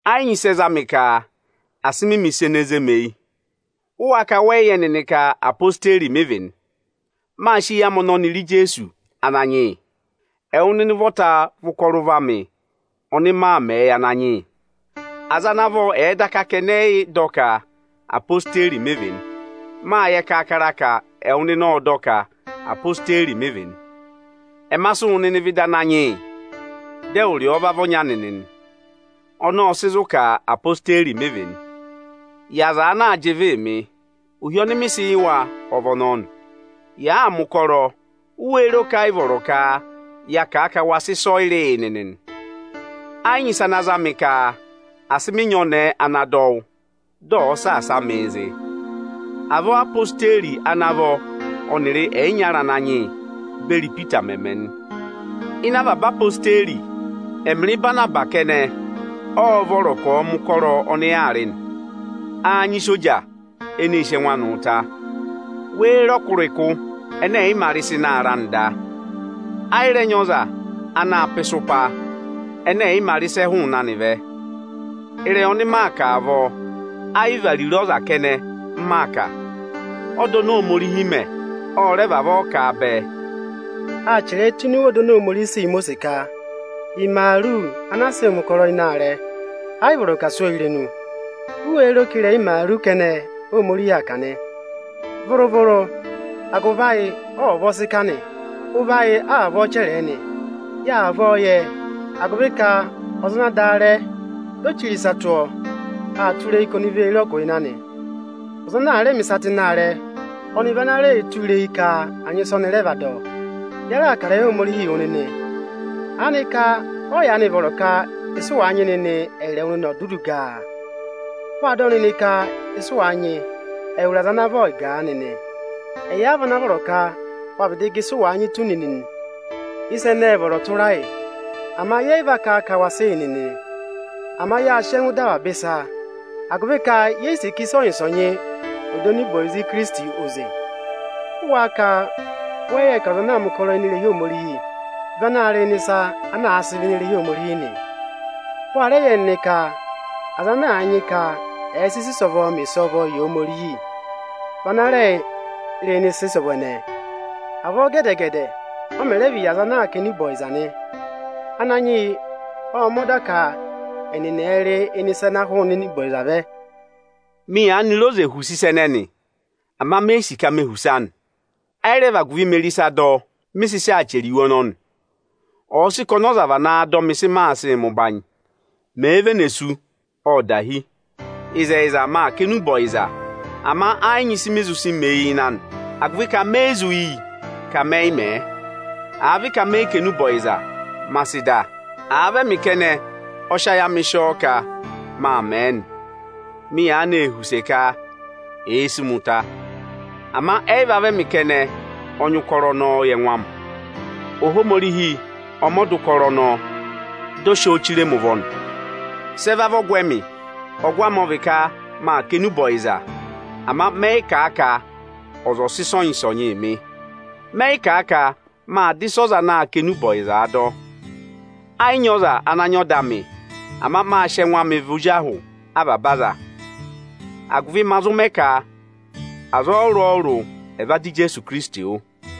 Ẹ yị nyị ịsị ẹ za mị ka asị mị mẹ̀ ịsa ene zé mi eyi. Ụ wáá ka wẹ yị yẹ nịnị ka ezirẹma Ijeesu mị vị nị? Mâ sị eyi amị ọnọnị re Ijeesu Ananyị yị. Ẹwụ nịnị ụvọta vị ụkọrọ ụvọ amị ọnị maa mẹẹ yị Ananyị yị. Aza ana vọ ẹ̀ẹ daka ka ẹnị ẹ yị dọ ka ezirẹma Ijeesu mị vị nị, mâ yẹ kaakara ka ẹwụ nịnị ộ dọ ka ezirẹma Ijeesu mị vị nị. Ẹma sị wụ nịnị vẹ ịdị Ananyị yị, dị ẹwụrị ọọ va vị ọnya nịnị nị. Ọnọọ ộ sị zụ̀ ka ezirẹma Ijeesu mị vị nị. Yị aza ana aa jị ịvịị mị, ohi ọnị mị sị yị wa ọ vị ọnọnị nị: Yaa mẹ̀ ụkọrọ, u wéé ro ka ẹ yị vọrọ ka yaa kà a ka wa sị ịsọyịrị yị nịnị nị? Ẹ yị nyị ịsa ana za mị ka asị mị nyị ọnẹẹ ana dọ wụ́, dị ọ̀ọ saasa mịị zị. Avọọ Ézirẹma Ijeesu ana vọ ọnịrị ẹyịnyara Ananyị yị beri Ipita mẹ̀ mẹ nị. Ịnị avaba Ézirẹma Ijeesu, ẹmịrị Ịbanabasị kẹnẹ ọ́ọ́ vọrọ ka ọ̀ọ mẹ̀ ụkọrọ ọnị yaa rị nị? Áá nyị isoja eneē sí ẹngụ anị ụta? Wéé re ọkụrịkụ ẹnẹ ẹ̀ yị mā rị ịsa ịnị aarẹ anị da? Ẹ yị rẹ nyị ọza anaā pá ịsụpa ẹnẹ ẹ̀ yị mā rị ịsị ẹ hụụnị anị vẹ. Ịrẹyị ọnị mị kà avọọ, ayị vị ariro ọza kẹnẹ m maa kà. Ọda oni Ohomorihi mẹ, ọ rẹ vavọọ kà bẹẹ. Itim 5.18Áa chẹrẹ ẹ tụ́ ịnị ọda oni Ohomorihi sị yị Imosiisi ka, “Imaaru ana aa sịị mẹ̀ ụkọrọ ịnị aarẹ, ayị vọrọ ka à sụ́ ọọ irenu.” U wéé ro ka ịrẹyị imaaru kẹnẹ Óhomorihi aa kà nị? Vụrụ-vụrụ, agụvị ayị ọ vavọọ sị kà a nị. Ụvọ ayị a vavọọ chẹrẹ ẹ nị. Yâ vavọọ yẹ, agụvị ka ọza ana dà aarẹ, di o chire ịsa tụ́ ọọ aa tụra eyi ka ọnị vee re ọgụ ịnị anị. Ọza ana raa mẹ̀ ịsa ịnị aarẹ, ọnị vị ana rẹẹ̄ tụra eyi ka áa nyị ịsị ọnị rẹ vaa dọ. Ya raà kà ịrẹyị Ohomorihi yị wụ nịnị. Aanịka ọ yị yaanị vọrọ ka ịsị ụ wàa nyị nịnị, ẹyịrị ẹwụ nịnị ò dudu gà a? Wâ dọ nịnị ka ịsị ụ wàa nyị, ẹwụrị aza ana vọ ẹ̀ gà a nịnị. Ẹyị a vana vọrọ ka wa vịdị gà ịsị ụ wàa nyị tù nịnị nị. Ịsa ẹnẹẹ ệ vọrọ tụra yị, ama yẹ yị va kà ka wa sị yị nịnị. Ama yâ sị ẹngụ dọ avaba ịsa, agụvị ka ye yi sì ka ịsọnyị-ịsọnyị ọ̀ dọ enube ọyịza Ikirisiti oze. Ụ wáá ka wẹ yị yẹ ka ọza ana aa mẹ̀ ụkọrọ ini irehi Ohomorihi vị anaā rị ịnị ịsa ana àa sị vẹ ini irehi Ohomorihi nị? Wa rẹ yẹ nịnị ka aza ana a nyị ka ẹ̀ẹ sị ịsa ịsọvọọ mẹ ịsọvọọ yị Ohomorihi vị ana rẹẹ̄ rị ịnị ịsa ịsọvọ ẹnẹẹ. Avọọ gẹdẹ-gẹdẹ ọ mẹ̀ rẹ vị yị aza anaā kà enube ọyịza nị. Ananyị yị ộ mẹ̀ ẹ ọda ka ẹnịnị ẹ̀ẹ rị ịnị ịsa ana hụụnị enube ọyịza vẹ. Mị yaanị re oze họ̀ use ịsa ẹnẹnị, ama me yi sì ka me họ̀ use anị. Ẹ yị rẹ vị agụvị mee re ịsaa dọ, mị sị sị aa chẹrẹ iwe ọnọnị. Ọ̀ọ sị kà ọnị ọza va naa dọ mị ịsị maa sịị mẹ ụbanyị, mèe vene sú, ộ dahi. Ịzẹyịza, maa kà enube ọyịza, ama ẹ yị nyị ịsị mị zụ sị mẹ eyi ịnị anị, agụvị ka me yi zụ yi ka mẹ yị mẹ̀ ẹ. Àa vị ka mẹ yị kà enube ọyịza, ma sị dà! Àa vị ẹmị kẹnẹ ọ sị ayị amị sị ọọ ka maa mẹ̀ ẹ nị, mị yaanị ee họ̀ use ka èe sí mi ụta. Ama ẹ yị va vị ẹmị kẹnẹ ọ nyị ụkọrọ ọnọọ yị ẹngụ amị. Ohomorihi ọ mẹ ọda ụkọrọ ọnọọ, dị ọ sị ọọ chire mi ụvọ nị. Sị ẹ va vị ọgụ ẹmị? Ọgụ amị ọ vị ka: Maa kà enube ọyịza, ama mẹ yị kà a ka ọza ọ̀ sị ịsọnyị-ịsọnyịị mị. Mẹ yị kà ka maa dọ ịsị ọza anaā kà enube ọyịzaā dọ. Ẹ yị nyị ọza ana nyị ọda amị; ama mâ sị ẹngụ amị vị ozi ahụ avaba aza, agụvị ma zụ mẹ ka aza ọrụrụ-ọrụrụ ẹ̀ va dọ Ijeesu Ikirisiti wụ́.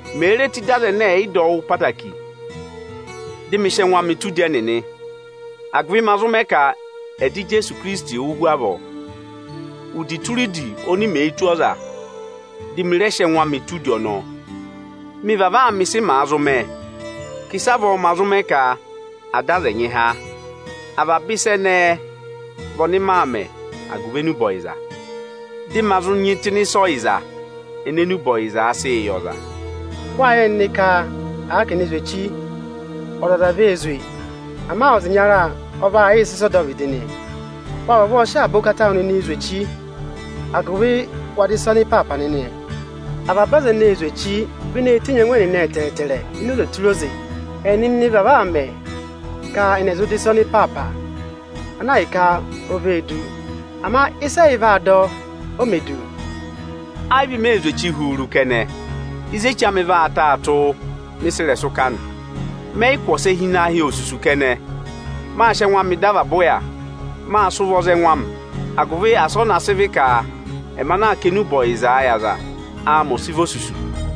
Mèe re tù ịdị aza ẹnẹ ẹdọwụ ẹnịnị ẹ̀ yị vavọọ katẹngụ, dị mị sị ẹngụ amị tụ́ udi ẹnịnị, agụvị ma zụ mẹ ka ẹ̀ dọ Ijeesu Ohinọyị oni Ohomorihi nyị ka ọ̀ dọ yị há wụ́ hu avọọ. Udi tụra udi oni mèe ne tù ọza, dị mị rẹ sị ẹngụ amị tụ́ udi ọnọọ. Mị vavọọ aa mẹ ịsị màa zụ mẹ, ka ịsavọọ ma zụ mẹ ka à dọ aza ẹnyị há. Avaba ịsa ẹnẹẹ vị ọnị maa mẹ̀ agụvị enube ọyịza, dị ma zụ nyị tụ́ ịnị ịsa ọyịza ene enube ọyịzaā sịị yị ọza. Wâ yẹ nịnị ka àa ka è ne zwe echi, ọzọza vee zwe, ama ọza ịnyara ọ vaa yịị sị ịsa ọdọvịdị nị. Waa vavọọ sị avaba ụkata awụ nịnị zwe echi, agụvị wa dọ ịsa ọnịpaapa nịnị. Avaba aza eneē zwe echi vị eneē tenyi ẹngụ ẹnịnị ẹtẹẹtẹrẹ ini oze tụra oze. Ẹnịnị vavọọ aa mẹ ka ẹnị ẹ̀ zụ dọ ịsa ọnịpaapa, ana hi ka o vee du. Ama ịsị ẹyị vaa dọ, o mē du. Ẹ yị vị mee zwe echi huuru kẹnẹ; ịzị echi amị vaa taa tụ́, mị sị ịrẹsụ kà nị. Mẹ yị kụ̀ ọsẹ hi ịnị ahị osusu kẹnẹ. Maa sị ẹngụ amịị dọ avaba ụya, maa sị ụvọọ za ẹngụ amị, agụvị asị ọ na sị vị ka ẹmị ana aa kà enube ọyịzaa yị ọza, áamị ọ̀ sị vị osusu.